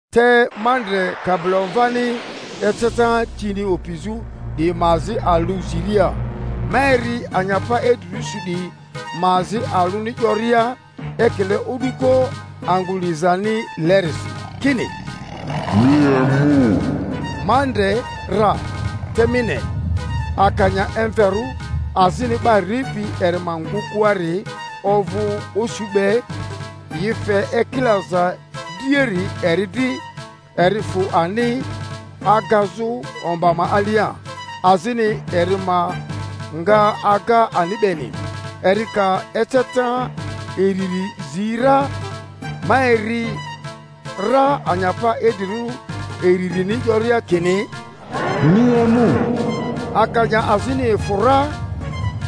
Te ma ndre Kabilomvani eceta tini opizᴜ 'diyi ma azi alᴜ ziria, ma eri anyapa idrirᴜ su 'diyi ma azi alᴜni 'yoria, ekile o'duko angᴜ lizanilerisi, kini, Mi emu! Ma ndre ra, te mi ne, akanya emverᴜ, azini 'ba ripi eri ma ngᴜkᴜari ovᴜ osu be; yi fe ekilaza driari eri dri, eri fᴜ ani agazᴜ omba ma alia, azini eri ma nga aga ani beni. Eri ka eceta iriri zi ra, ma eri ra anyapa idrirᴜ iririni 'yoria kini, Mi emu! Akanya azini efᴜ ra,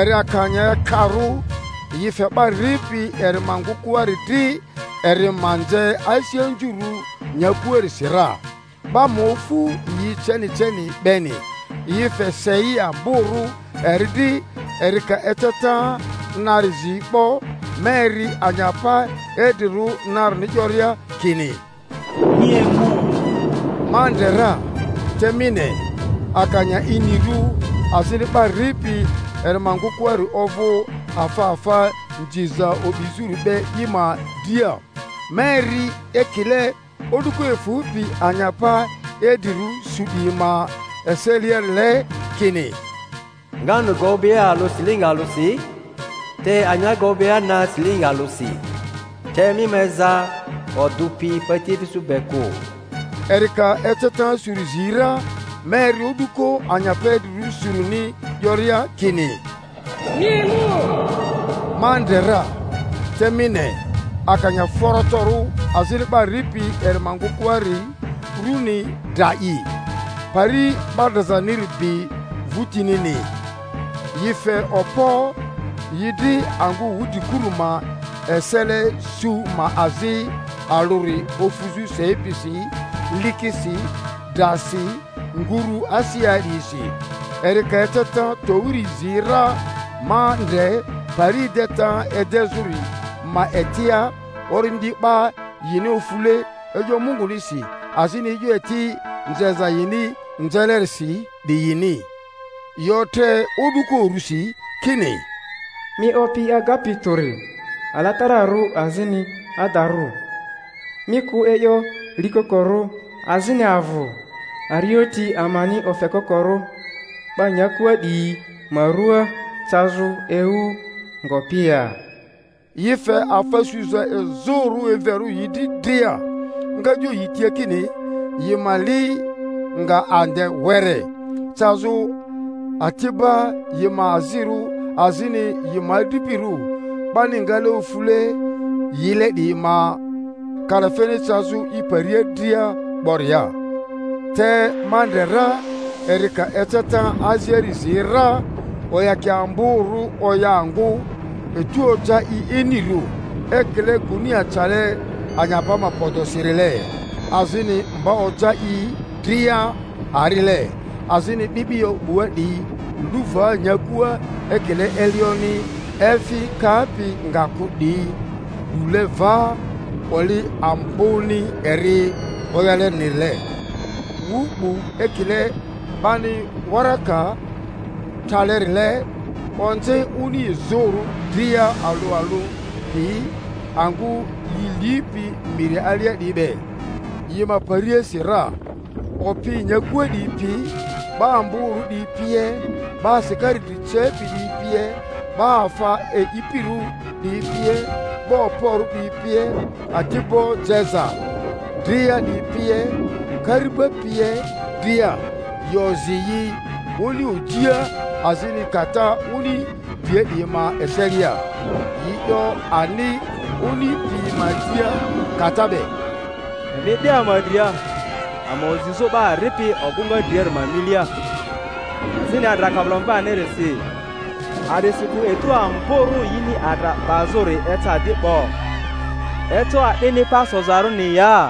eri akanya ekarᴜ; yi fe 'ba ripi eri ma ngᴜkᴜari dri eri ma nze asi anzurᴜ nyakuarisi ra, 'ba ma ofu yi ceni ceni beni; yi fe sei amborᴜ eri dri. Eri ka eceta nari zi 'bo, ma eri anyapa idrirᴜ narini 'yoria kini, Mi emu! Ma ndre ra, te mi ne, akanya inirᴜ; azini 'ba ripi eri ma ngᴜkᴜari ovᴜ afa afa nziza o'bizᴜri be i ma dria. Ma eri ekile o'duko efᴜpi anyapa idrirᴜ su 'diyi ma eseliarile kini, Nganu gobea alᴜ silingi alᴜsi, te anya gobea na silingi alᴜsi; te mi ma eza odᴜ pi patiefi su be kᴜ. Eri ka eceta suri zi ra, ma eri o'duko anyapa idrirᴜ surini 'yoria kini, Mi emu! Ma ndre ra, te mi ne, akanya forotorᴜ, azini 'ba ripi eri ma ngᴜkᴜari rᴜni Dra'i; Pari 'ba drazaniri bi vᴜtinini. Yi fe okpo yi dri angᴜ wudrikurᴜ ma esele su ma azi alᴜri ofuzᴜ sei pisi, likisi, drasi, nguru asea 'diyisi. Eri ka eceta towiri zi ra, ma ndre pari edeta edezᴜri ma etia orindi 'ba yini ofule e'yo Mungunisi, azini e'yo eti nzeza yini nzelerisi 'diyini; yi otre o'duko urusi kini, Mi Opi Agapi Tᴜri, alatararᴜ azini adarᴜ, mi kᴜ e'yo likokorᴜ, azini avᴜ arioti amani ofekokorᴜ 'ba nyakua 'diyi ma ruaa cazᴜ ewu ngopi ya? Yi fe afa suza izᴜrᴜ emverᴜ yi dri dria; nga 'yo yi tia kini yi ma li nga ande were, cazᴜ ati'ba yi ma azirᴜ azini yi ma adripirᴜ, 'bani ngale ofule yile 'diyi ma kalafeni cazᴜ i paria dria 'boria. Te ma ndre ra eri ka eceta aziari zi ra, oyakia amborᴜ oya angᴜ, etu oja i inirᴜ ekile gunia cale anyapa ma podosirile, azini mba oja i dria arile, azini 'bi'bio 'bua 'diyi lu va nyakua ekile elioni efi kapi nga kᴜ 'diyi lule va oli amboni eri oyalenirile; wu 'bu ekile 'bani waraka tralerile, onze oni izᴜrᴜ dria alᴜ alᴜ piyi, angᴜ yi lipi miri alia 'diyi be, yi ma pariasi ra. Opi nyakua 'diyi pi, 'ba amborᴜ 'diyi pie, 'ba asikari dri cepi 'diyi pie, 'ba afa e'ipirᴜ 'diyi pie, 'ba okporᴜ 'diyi pie, ati'bo jeza dria 'diyi pie, kari'ba pie dria, yi ozi yi oni ojia azini kata oni dria 'diyi ma eselia; yi 'yo ani oni piyi ma tia kata be, Emi e'de ama dria, ama ozizᴜ 'ba ripi ogᴜŋa driari ma milia, azini adra Kabilomvanirisi; a'disikᴜ etu amborᴜ yini adra 'bazᴜri eca di 'bo; eco a'dini pa sozarᴜni ya?